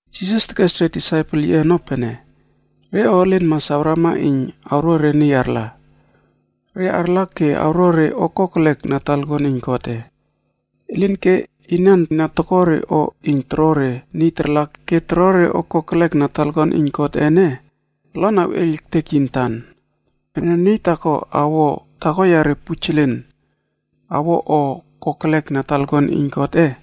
Jisas tekes re disaipel yiꞌe ono pene, “Re o elen mas awrama iyn awro re niy arla. Re arla ke awro re o kokelek na talakuan iyn Godꞌe. Elinke, inan na toko re o iyn toro re niy tarla ke toro re o kokelek na talakuan iyn Godꞌe ene, olon awꞌeiyl ektek yi antan. Pene niy taako awo taako yare pujelen awo o kokelek na talakuan iyn Godꞌe,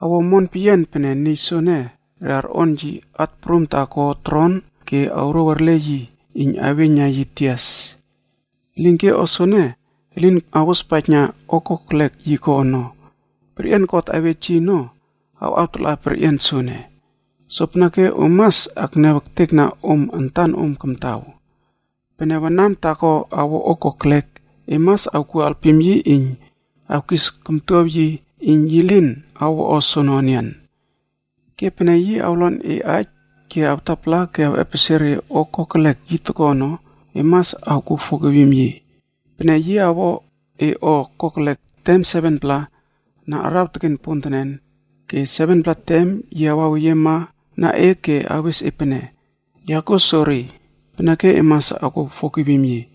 awo omon peyian pene niy soene re arꞌon yi at prum taako tron ke re awrouw erle yi iyn aweiyn na yi tias. Elinke o soene, elin awospaijna o kokelek yi ko ono. Perꞌian God awej yi ono awꞌawtala perꞌian soene. “Sopeneke om mas akniaw ektekna om antanom kamtaw. Pene wanam taako awo o kokelek, e mas awkuo alpim yi iyn awkis oktow yi aij iyn yi lin awo o soono enian. Ke pene yi awlonpaijna e aij ke awtapala ke awꞌepesie re o kokelek yi toko ono, e mas awkuo fogivim yi. Pene yi awo e o kokelek tem 7-pla na araw teken pontenen, ke 7-pla tem yi awaweyiemana e ke awes e pene, ‘Ya kuo sori,’ peneke e mas awkuo fogivim yi.”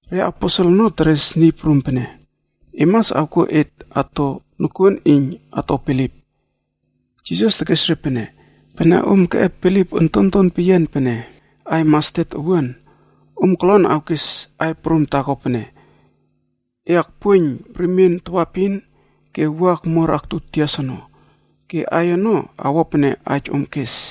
ReAposel ono teres Niy Prum pene, “E mas awkuo et ato nokuon iyn ato bilip.” Ke Niy Prum tekes re pene, “Pene om keꞌep bilip ontonton peyian pene aiy mastet owuan,a om kolon awkes aiy prum taako pene, ‘E akpuoiyn remien tawaepin ke wua akmuar aktu tias ono.’ Ke aiy ono awo pene aij om kes.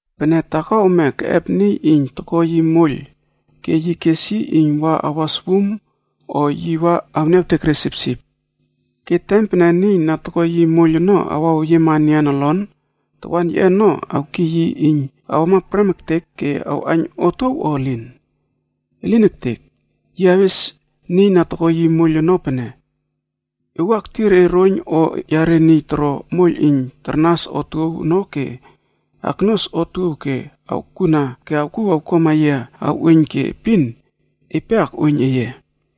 “Pene taako ome keꞌep niy iyn toko yi moiylb ke yi kes yi iyn wa awas wum o yi wa awniawtek re sipsip. Ke tem pene niy na toko yi moiyl ono awaweyiema enian olon, tawan yiꞌe ono awkiy yi iyn awama prem ektek ke awꞌaiyn otuow o elin? Elin ektek! Yi awes niy na toko yi moiyl ono pene, ‘E wua ektir e roiyn o yare niy toro moiyl iyn tarnas otuow ono ke aknuas otuow ke awkuna ke awkuw awkuama yia awꞌuoiyn ke epin, epe akꞌuoiyn eye.’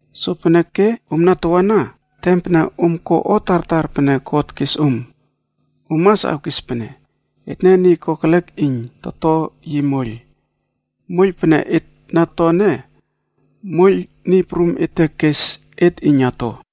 Sopeneke omna tawana, tem pene om ko o tartar pene God kes om, om mas awkes pene, ‘Etne niy kokelek iyn toto yi moiyl. Moiyl pene et na to ene, moiyl Niy Prum ete kes et iyn ato.’”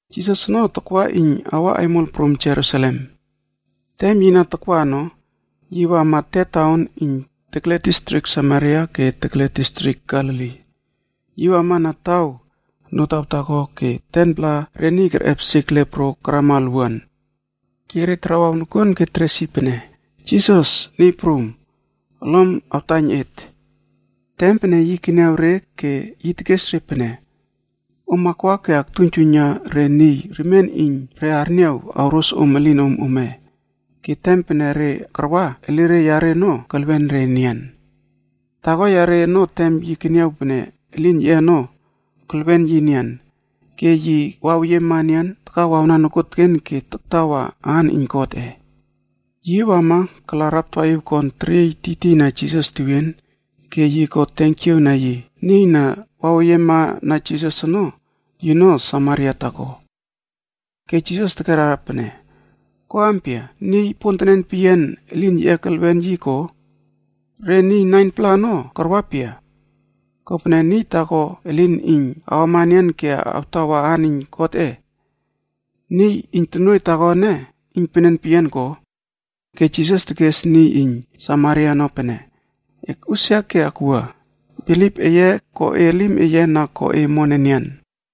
Jisas ono takwa iyn yi awa aimol prum Jerusalem. Tem yi na takwa ono, yi wama te taon iyn tekle distrik Samaria ke tekle distrik Galili. Yi wama na taw notaw taako ke 10-pla re niy kerꞌep sik leproc karama olwuan. Ke re tarawaw nokuon ke teres yi pene, “Jisas, niy prum, olom awtaiyn et.” Tem pene yi keniaw re ke yi tekes re pene, “Om akwa ke aktuiynjuiyna re niy remien iyn re arniaw awros om elinom ome.”d Ke tem pene re karwa, elire yare ono kelwen re enian. Taako yare ono tem yi keniaw pene elin yiꞌe ono kelwen yi enian, ke yi waweyiema enian takawawna nokuon ke taktawa aan iyn Godꞌe. Yi wama kala raptawaꞌiw kon teriey tiytiyna Jisas tewien ke yi ko tenkiaw na yi. Niy na waweyiema na Jisas ono, yino Samaria taako. Ke Jisas tekera pene, “Ko ampia, niy pontenen peyian elin yiꞌe kelwen yi ko? Re niy 9-pla ono karwa pia? Kopene niy taako elin iyn awama enian ke awtawa aan iyn Godꞌe. Niy iyn tonuoiy taako ene iynpenen peyian ko?” Ke Jisas tekes niy iyn Samaria ono pene, “Ekꞌusia ke ekwua, bilip eye ko e elim eye, na ko e omon enian.”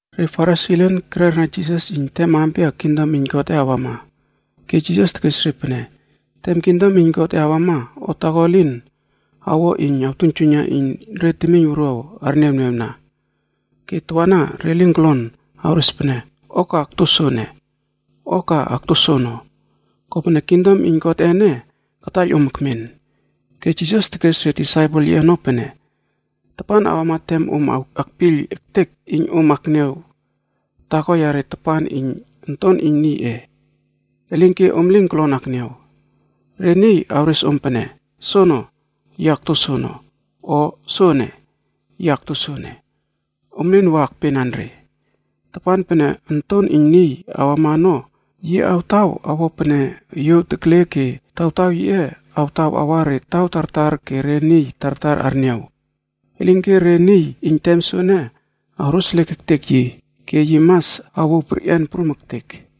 Re Farisi elen kererna Jisas iyn tem ampia kingdom iyn Godꞌe awama, ke Jisas tekes re pene, “Tem kingdom iyn Godꞌe awama, o taako elin awo iyn awtuiynjuiyna iyn re temiyn wuruaw arniawniawna. Ke tawana re lin kolon awres pene, ‘O ka akto soene’ o ‘O ka akto soono,’ kopene kingdom iyn Godꞌe ene kataiyl om ekmen.” Ke Jisas tekes re disaipel yiꞌe ono pene, “Tapan awama tem om akpiyl ektek iyn om akniaw taako yare tapan iyn Onton iyn Niyꞌe. Elinke om lin kolon akniaw. Re niy awres om pene, ‘Soono, yi akto soono,’ o ‘Soene, yi akto soene!’ Om lin wa akpenan re. Tapan pene Onton iyn Niy awama ono, yi awtaw awo pene yuow tekle ke tawtaw yiꞌe awtaw awa re taw tartar ke re niy tartar arniaw. Elinke re niy iyn tem soene awroseliek ektek yi, ke yi mas awouw perꞌian prum ektek.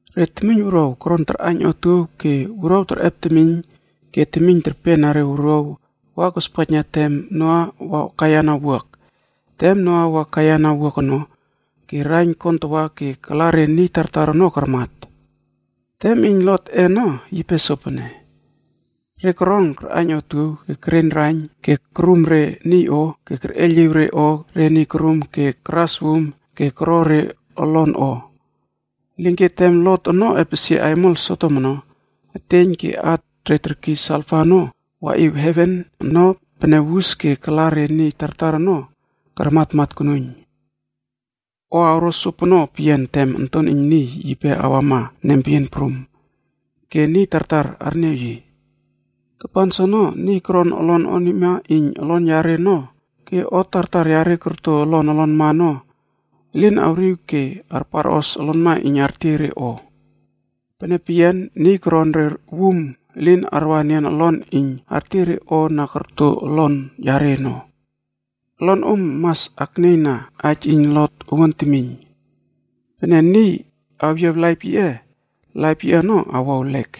Re temiyn wuruaw koron tarꞌaiyn otuow ke wuruaw terꞌep temiyn ke temiyn terpena re wuruaw wa kospaijna tem Noa wa kaiyana wuak. Tem Noa wa kaiyana wuak ono, ke raiyn kontawa ke kala re niy tartar ono karmat. “Tem iyn Lotꞌef ono yipe sopono. Re koron karꞌaiyn otuow, ke kereiyn raiyn, ke korum re niy o, ke kerꞌeiyliw o re niy korum ke karas wum ke koro re olon o. Elinke tem Lot ono epesie aimol Sodom ono, eteiyn ke at re terkiy salfa ono waꞌiw heven ono pene wus ke kala re niy tartar ono karmatmat konuiyn. “O awro sopono peyian tem Onton iyn Niy yipe awama nempeyian prum ke niy tartar arniaw yi. Tapan soono, niy koron olon onima iyn olon yare,g ono ke o tartar yare korto olon olonma ono elin awriw ke arparꞌos olonma iyn artiey re o. Pene peyian, niy koron re wum elin arwa enian olon iyn artiey re o na korto olon yare ono. Olon om mas aknieyna aij iyn Lot owuan temiyn!h Pene niy awyiaw laip yiꞌe, laip yiꞌe ono awo ewlek.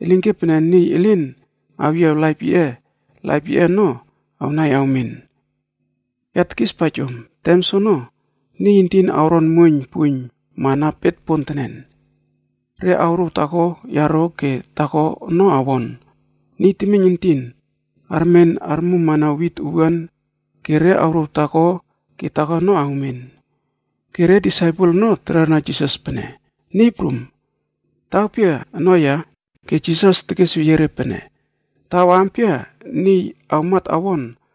Elinke pene niy elin awyiaw laip yiꞌe, laip yiꞌe ono awnai awmen. “Ya tekispaij om, tem soono niy entin awron muoiyn puiyn mana bet pontenen, re awrouw taako yaro ke taako ono awon. Niy temiyn entin armen armummana wit owuan ke re awrouw taako ke taako ono awmen.” Ke re disaipel ono terera Jisas pene, “Niy Prum, taw pia ono ya?” Ke Jisas tekesweyie re pene, “Taw ampia niy awmat awon,